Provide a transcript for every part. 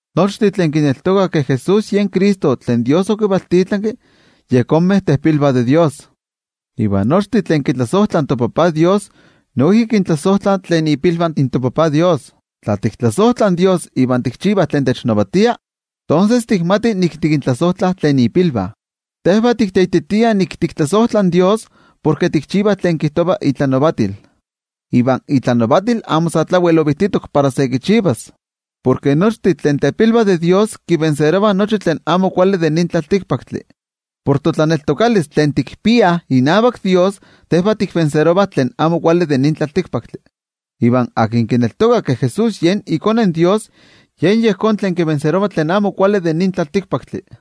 Nochtin tlen kineltokah ke Jesús yen Cristo tlen toYejwatzi okivaltitlanki, yejonmeh tepilvah de Dios. Iva nochtin tlen kitlasojtlah toTajtzin Dios, noijki kintlasojtlah tlen ipilvah in toTajtzin Dios. Tla tiktlasojtlah in toYejwatzi iva tikchivah tlen technavatia, tonses tikmatih nik tikintlasojtlah tlen ipilvah. Tejvah tikteititiah nik tiktlasojtlah in toYejwatzi porke tikchivah tlen kijtova itlanavatil. Iva itlanavatil amo sa tlawel ovijtitok para se kichivas. Porke nochtin tlen tepilvah de Dios kitlaniliah nochi tlen amo kuali de nin tlaltikpaktli. Por totlaneltokalis tlen tikpiah inavak toYejwatzi, tejvah tiktlaniliah tlen amo kuali de nin tlaltikpaktli. Iva tlen kineltoka ke Jesús yen iKone in Dios, yen yejón tlen kitlanilia tlen amo kuali de nin tlaltikpaktli.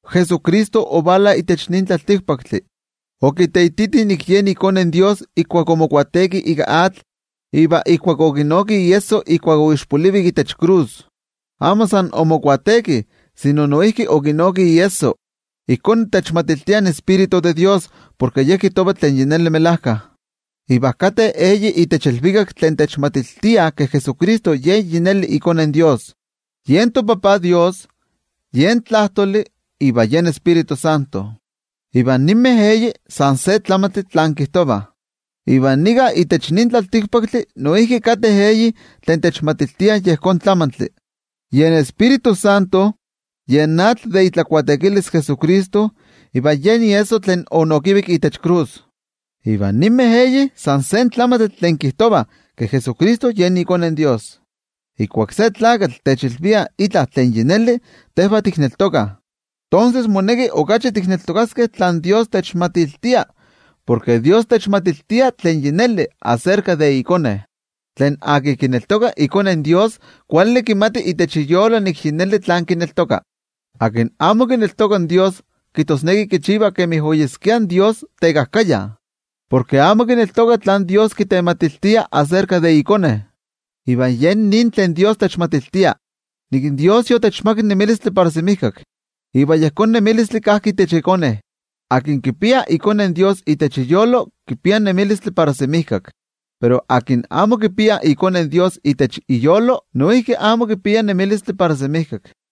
Jesucristo ovala itech nin tlaltikpaktli. Okiteititi nik yen iKone in Dios ijkuak omobautisaro ika atl iva ijkuak okinoki iesso ijkuak oixpolivik itech krus. Amo san omobautisaro, sino noijki okinoki iesso. Ijkó techmatiltia iTioijyotzi in toYejwatzi porke Ye kijtova tlen melajkayotl. Iva kateh eyih itech ilvikak tlen techmatiltiah ke Jesucristo yi neli iKone in Dios: yen toTajtzin Dios, yen Tlajtoli iva yen Tioijyotzintli. Iva ninmeh eyih san se tlamantli tlen kijtovah. Iva nika itech nin tlaltikpaktli noijki kateh eyih tlen techmatiltiah yejón tlamantli: yen Tioijyotzintli, yen atl ijkuak Jesucristo omobautisaro, iva yen iesso tlen onokivik itech krus. Iva ninmeh eyih san se tlamantli tlen kijtovah ke Jesucristo yen iKone in Dios. Ijkuak se tlakatl techilvia itla tlen yi neli, tejvah tikneltokah. Tonses, moneki okachi tikneltokaskeh tlen toYejwatzi techmatiltia, porke toYejwatzi techmatiltia tlen yi neli aserka de iKone. Tlen kineltoka iKone in Dios, kuali kimati itech iyolo nik yi neli tlen kineltoka. Tlen amo kineltoka in toYejwatzi, kijtosneki kichiva kemi oyeskia in toYejwatzi tekajkaya, porke amo kineltoka tlen toYejwatzi kitematiltia aserka de iKone. Iva yen nin tlen toYejwatzi techmatiltia: ke toYejwatzi yotechmakak nemilistli para semijkak, iva yejón nemilistli kajki itech iKone. Tlen kipia iKone in Dios itech iyolo, kipia nemilistli para semijkak. Pero tlen amo kipia iKone in Dios itech iyolo, noijki amo kipia nemilistli para semijkak.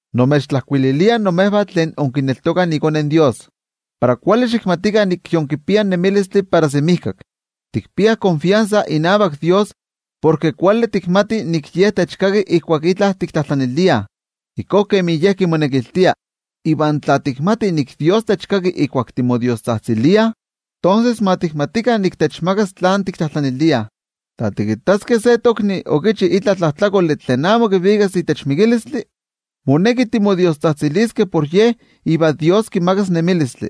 Nimechtlajkuililia imejvah tlen inkineltokah iKone in Dios, para kuali xikmatikah nik yinkipiah nemilistli para semijkak. Tikpiah netenmachilistli inavak toYejwatzi porke kuali tikmatih nik in Ye techkaki ijkuak itla tiktlajtlaniliah ijkó kemi Ye kimonekiltia. Iva tla tikmatih nik in toYejwatzi techkaki ijkuak timodiostzajtziliah, tonses ma tikmatikah nik techmakas tlen tiktlajtlaniliah. Tla tikittaskeh se tokni okichi itla tlajtlakoli tlen amo kivikas itech mikilistli, moneki timodiostzajtziliskeh por ye iva toYejwatzi kimakas nemilistli,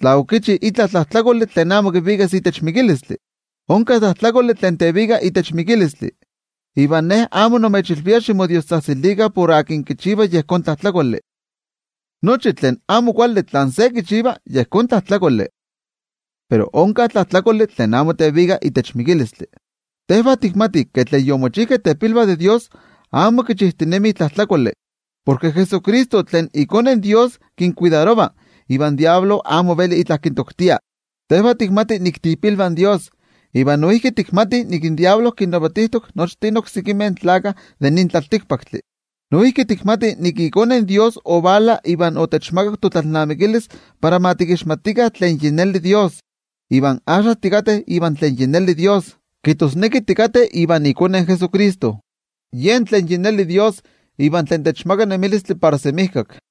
tla okichi itla tlajtlakoli tlen amo kivikas itech mikilistli. Onka tlajtlakoli tlen tevika itech mikilistli, iva ne amo nimechilvia ximodiostzajtzilikah por tlen kichiva yejón tlajtlakoli. Nochi tlen amo kuali tlen se kichiva yejón tlajtlakoli. Pero onka tlajtlakoli tlen amo tevika itech mikilistli. Tejvah tikmatih ke tlen yomochijkeh tepilvah de Dios amo kichijtinemih tlajtlakoli, porke Jesucristo tlen iKone in Dios kinkuidarova, iva in Amo Kuali Tlakatl amo veli itla kintoktia. Tejvah tikmatih nik tiipilvah in Dios, iva noijki tikmatih ke in Amo Kuali Tlakatl kinnavatijtok nochtin oksekimeh tlaltikpaktlakah. Noijki tikmatih ke iKone in Dios ovala, iva otechmakak totlalnamikilis para ma tikixmatikah tlen yi neli Dios. Iva axka tikateh ivan tlen yi neli Dios, kijtosneki tikateh ivan iKone Jesucristo. Yen tlen yi neli Dios iva tlen techmaka nemilistli para semijkak.